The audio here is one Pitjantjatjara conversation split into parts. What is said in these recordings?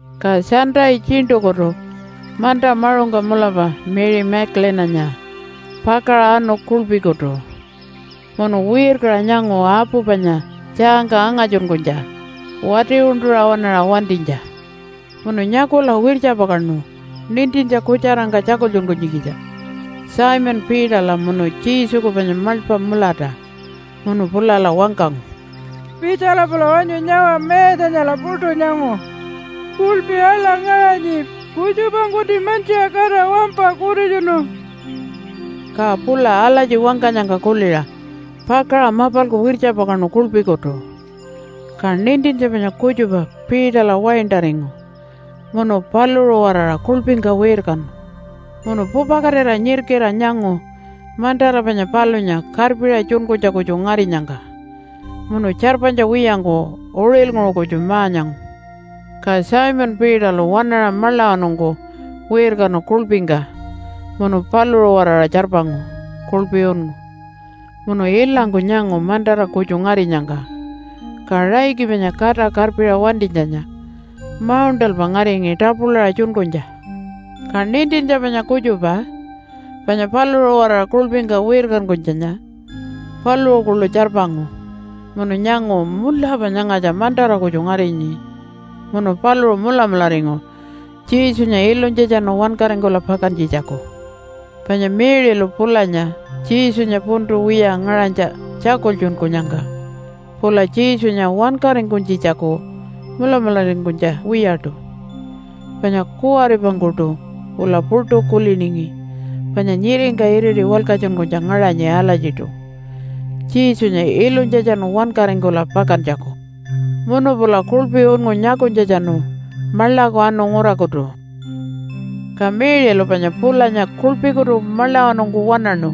Ka Sunday tjiṉṯukutu manta maṟungka mulapa Mary Magdalene-anya pakaṟa anu kuḻpikutu, munu wirkaṟa nyangu apu panya tjaangka angatjunkunytja wati-uṉṯuṟa waṉaṟa wantinytja. Munu nyakula wirtjapakaṉu nintintja kutjarangka tjakultjunkunytjikitja Simon Peterla munu Jesuku panya maḻpa mulata. Munu pulala wangkangu, “Pitjala pula wanyu nyawa. Mayatjanyala puṯu nyangu. Kuḻpi aḻa ngaṟanyi. Kutjupangkunti mantjiṟa katira wampa kutitjunu.” Ka pula alatji wangkanyangka kuliṟa pakaṟa mapalku wirtjapakaṉu kuḻpikutu. Ka nintintja panya kutjupa Peterla waintaringu munu paluṟu-waraṟa kuḻpingka wirkanu. Munu pupakatira nyirkiṟa nyangu mantara panya palunya karpiṟa tjunkunytja kutju ngarinyangka. Munu tjarpanytja wiyangku uṟilnguṟu kutju ma-nyangu. Ka Simon Peterlu waṉaṟa maḻawanungku wirkanu kuḻpingka munu paluṟu-waraṟa tjarpangu kuḻpi unngu. Munu ilangku nyangu mantara kutju ngarinyangka. Ka raiki panya kata karpiṟa wantinytjanya mauṉṯalpa ngaringi tapulaṟa tjunkunytja. Ka nintintja panya kutjupa, panya paluṟu-waraṟa kuḻpingka wirkankunytjanya, paluṟu kuḻu tjarpangu, munu nyangu, “Mulapa nyangatja mantara kutju ngarinyi.” Munu paluṟu mulamularingu Jesunya ilunytjatjanu wankaringkula pakantjitjaku. (Panya Mary-lu pulanya Jesunya puntu wiya ngaṟanytja tjakultjunkunyangka pula Jesunya wankaringkunytjitjaku mulamularingkunytja wiyaṯu. Panya kuwaripangkuṯu pula puṯu kuliningi panya nyiringka iriti walkatjunkunytja ngaṟanyi alatjiṯu Jesunya ilunytjatjanu wankaringkula pakantjaku.) Munu pula kuḻpi unngu nyakunytjatjanu maḻaku anu ngurakutu. Ka Mary-lu panya pulanya kuḻpikutu maḻawanungku waṉaṉu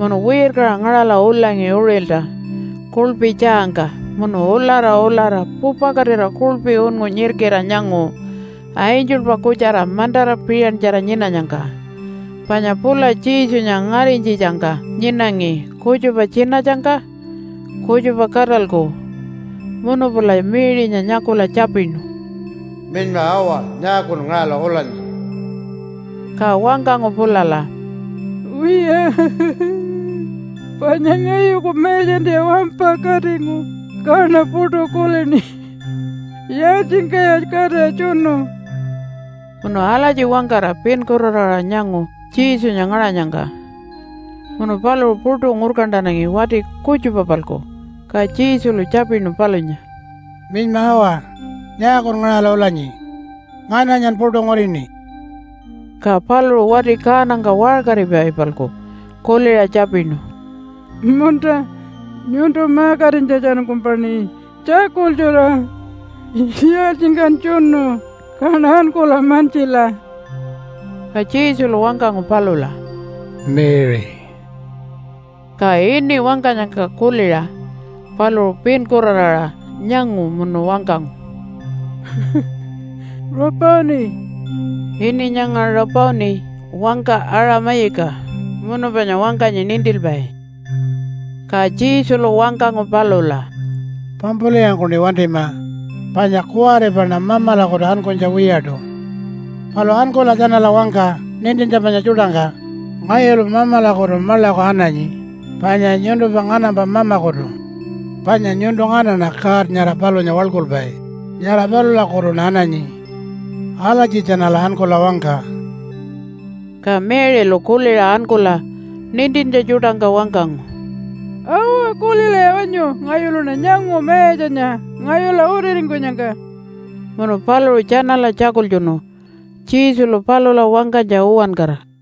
munu wirkaṟa ngaṟala ulangi uṟilta kuḻpi tjaangka munu ulara ulara pupakatira kuḻpi unngu nyirkiṟa nyangu angelpa kutjara mantara piṟantjara nyinanyangka. Panya pula Jesunya ngarinytjitjangka nyinangi kutjupa tjinatjangka, kutjupa katalku. Munu pula Mary-nya nyakula tjapinu, “Minyma awa, nyaakun ngaṟala ulanyi?” Ka wangkangu pulala, “Wiya, panya ngayuku Mayatjantiya wampa katingu, kaṉa puṯu kulini, ‘Yaaltjingkaya katira tjunu?’” Munu alatji wangkara pinkuraraṟa nyangu Jesunya ngaṟanyangka, munu paluṟu puṯu ngurkantanangi wati kutjupa-palku. Ka Jesulu tjapinu palunya, “Minyma awa, nyaakun ngaṟala ulanyi? Ngananyan puṯu ngurini?” Ka paluṟu wati kaanangka waṟkaripai-palku kuliṟa tjapinu, “Munta, nyuntu ma-katinytjatjanungkumpaṉi tjakultjura, ‘Yaaltjingkan tjunu?’ Kaṉa ankula mantjila.” Ka Jesulu wangkangu palula, “Mary!” Ka ini wangkanyangka kuliṟa paluṟu pinkuraraṟa nyangu munu wangkangu, “Rabboni!” (Ini nyanga Rabboni wangka Aṟa-mayiki munu panya wangkanyi Nintilpai.) Ka Jesulu wangkangu palula, “Pampulwiyangkuṉi wantima panya kuwaripaṉa Mamalakutu ankunytja wiyaṯu. Palu ankula tjanala wangka nintintja panya tjuṯangka, ‘Ngayulu Mamalakutu maḻaku ananyi, panya nyuntumpa nganampa Mamakutu. Panya nyuntu nganaṉa God nyara palunya waḻkulpai, nyara palulakutuṉa ananyi.’ Alatji tjanala ankula wangka.” Ka Mary-lu kuliṟa ankula nintintja tjuṯangka wangkangu, “Awa, kulilaya wanyu! Ngayuluṉa nyangu Mayatjanya ngayula utiringkunyangka.” Munu paluṟu tjanala tjakultjunu Jesulu palula wangkanytja uwankara.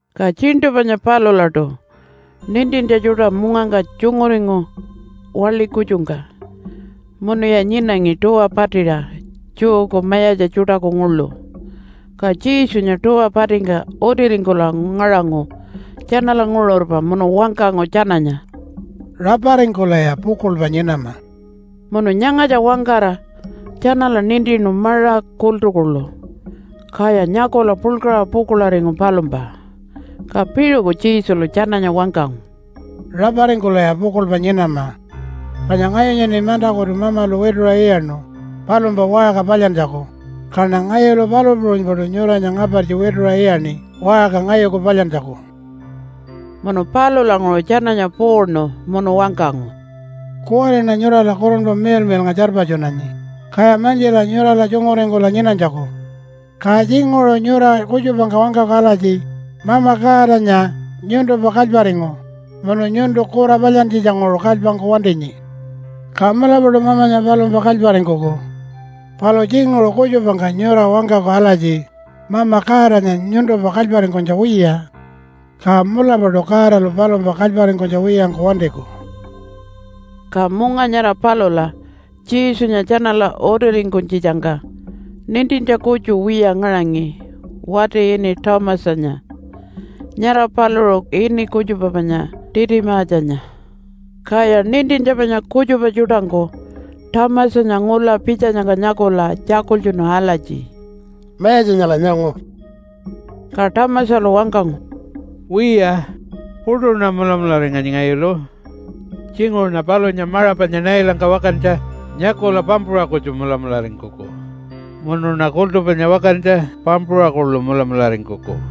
Ka tjiṉṯu panya palulaṯu nintintja tjuṯa mungangka tjunguringu waḻi kutjungka munuya nyinangi tuwa patiṟa Jewku mayatja tjuṯaku nguḻu. Ka Jesunya tuwa patingka utiringkula ngaṟangu tjanala nguṟurpa munu wangkangu tjananya, “Raparingkulaya pukuḻpa nyinama!” Munu nyangatja wangkara tjanala nintinu maṟa kultu kuḻu, kaya nyakula puḻkaṟa pukuḻaringu palumpa. Ka piṟuku Jesulu tjananya wangkangu, “Raparingkulaya pukuḻpa nyinama. Panya ngayunyaṉi mantakutu Mamalu wituṟa iyaṉu palumpa waṟka palyantjaku, kaṉa ngayulu palu puṟunypaṯu nyuranya ngapartji wituṟa iyaṉi waṟka ngayuku palyantjaku.” Munu palulanguṟu tjananya puuṉu munu wangkangu, “Kuwariṉa nyurala Kurunpa Miḻmiḻnga tjarpatjunanyi, kaya mantjila nyurala tjunguringkula nyinanytjaku. Ka tjinguṟu nyura kutjupangka wangkaku alatji, ‘Mama Godanya nyuntumpa kalyparingu munu nyuntu kura palyantjitjanguṟu kalypangku wantinyi.’ Ka mulapaṯu Mamanya palumpa kalyparingkuku. Palu tjinguṟu kutjupangka nyura wangkaku alatji, ‘Mama Godanya nyuntumpa kalyparingkunytja wiya.’ Ka mulapaṯu Godalu palumpa kalyparingkunytja wiyangku wantiku.” Ka munga nyara palula Jesunya tjanala utiringkunytjitjangka nintintja kutju wiya ngaṟangi wati ini Thomasanya. (Nyara paluṟu ini kutjupa panya Titimatjanya.) Kaya nintintja panya kutjupa tjuṯangku Thomasanya ngula pitjanyangka nyakula tjakultjunu alatji, “Mayatjanyala nyangu.” Ka Thomasalu wangkangu, “Wiya, puṯuṉa mulamularinganyi ngayulu. Tjinguṟuṉa palunya maṟa panya nailangka wakantja nyakula pampuṟa kutju mulamularingkuku, munuṉa kultu panya wakantja pampuṟa kuḻu mulamularingkuku.”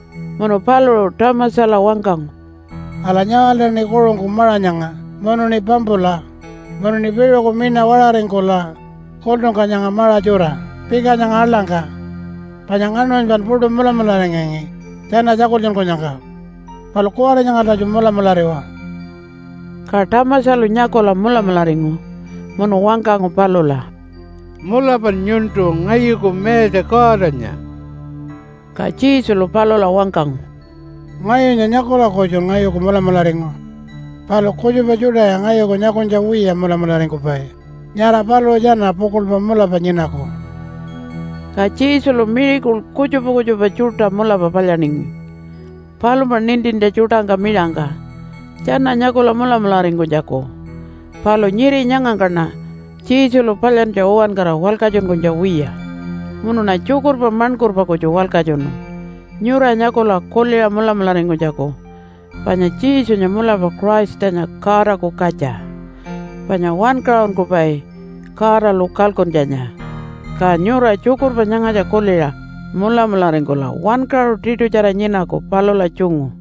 Munu paluṟu Thomasala wangkangu, “Ala, nyawaltaṉi kuṟungku maṟa nyanga munuṉi pampula, munuṉi piṟuku miṉa waṟaringkula kultungka nyanga maṟa tjura pika nyanga aḻangka. Panya ngaṉmanypan puṯu mulamularingangi tjana tjakultjunkunyangka. Palu kuwari nyangaltatju mulamulariwa.” Ka Thomasalu nyakula mulamularingu munu wangkangu palula, “Mulapan nyuntu ngayuku Mayatja Godanya!” Ka Jesulu palula wangkangu, “Ngayunya nyakula kutjun ngayuku mulamularingu. Palu kutjupa tjuṯaya ngayuku nyakunytja wiya mulamularingkupai, nyara paluṟu tjana pukuḻpa mulapa nyinaku.” Ka Jesulu miracle kutjupa kutjupa tjuṯa mulapa palyaningi palumpa nintintja tjuṯangka miṟangka tjana nyakula mulamularingkunytjaku. Palu nyiri nyangangkaṉa Jesulu palyantja uwankara walkatjunkunytja wiya munuṉa tjukurpa maṉkurpa kutju walkatjunu nyura nyakula kuliṟa mulamularingkunytjaku panya Jesunya mulapa Christanya Godaku katja, panya Wankaṟunkupai Godalu kalkuntjanya. Ka nyura tjukurpa nyangatja kuliṟa mulamularingkula wankaṟu tiṯutjara nyinaku palula tjungu.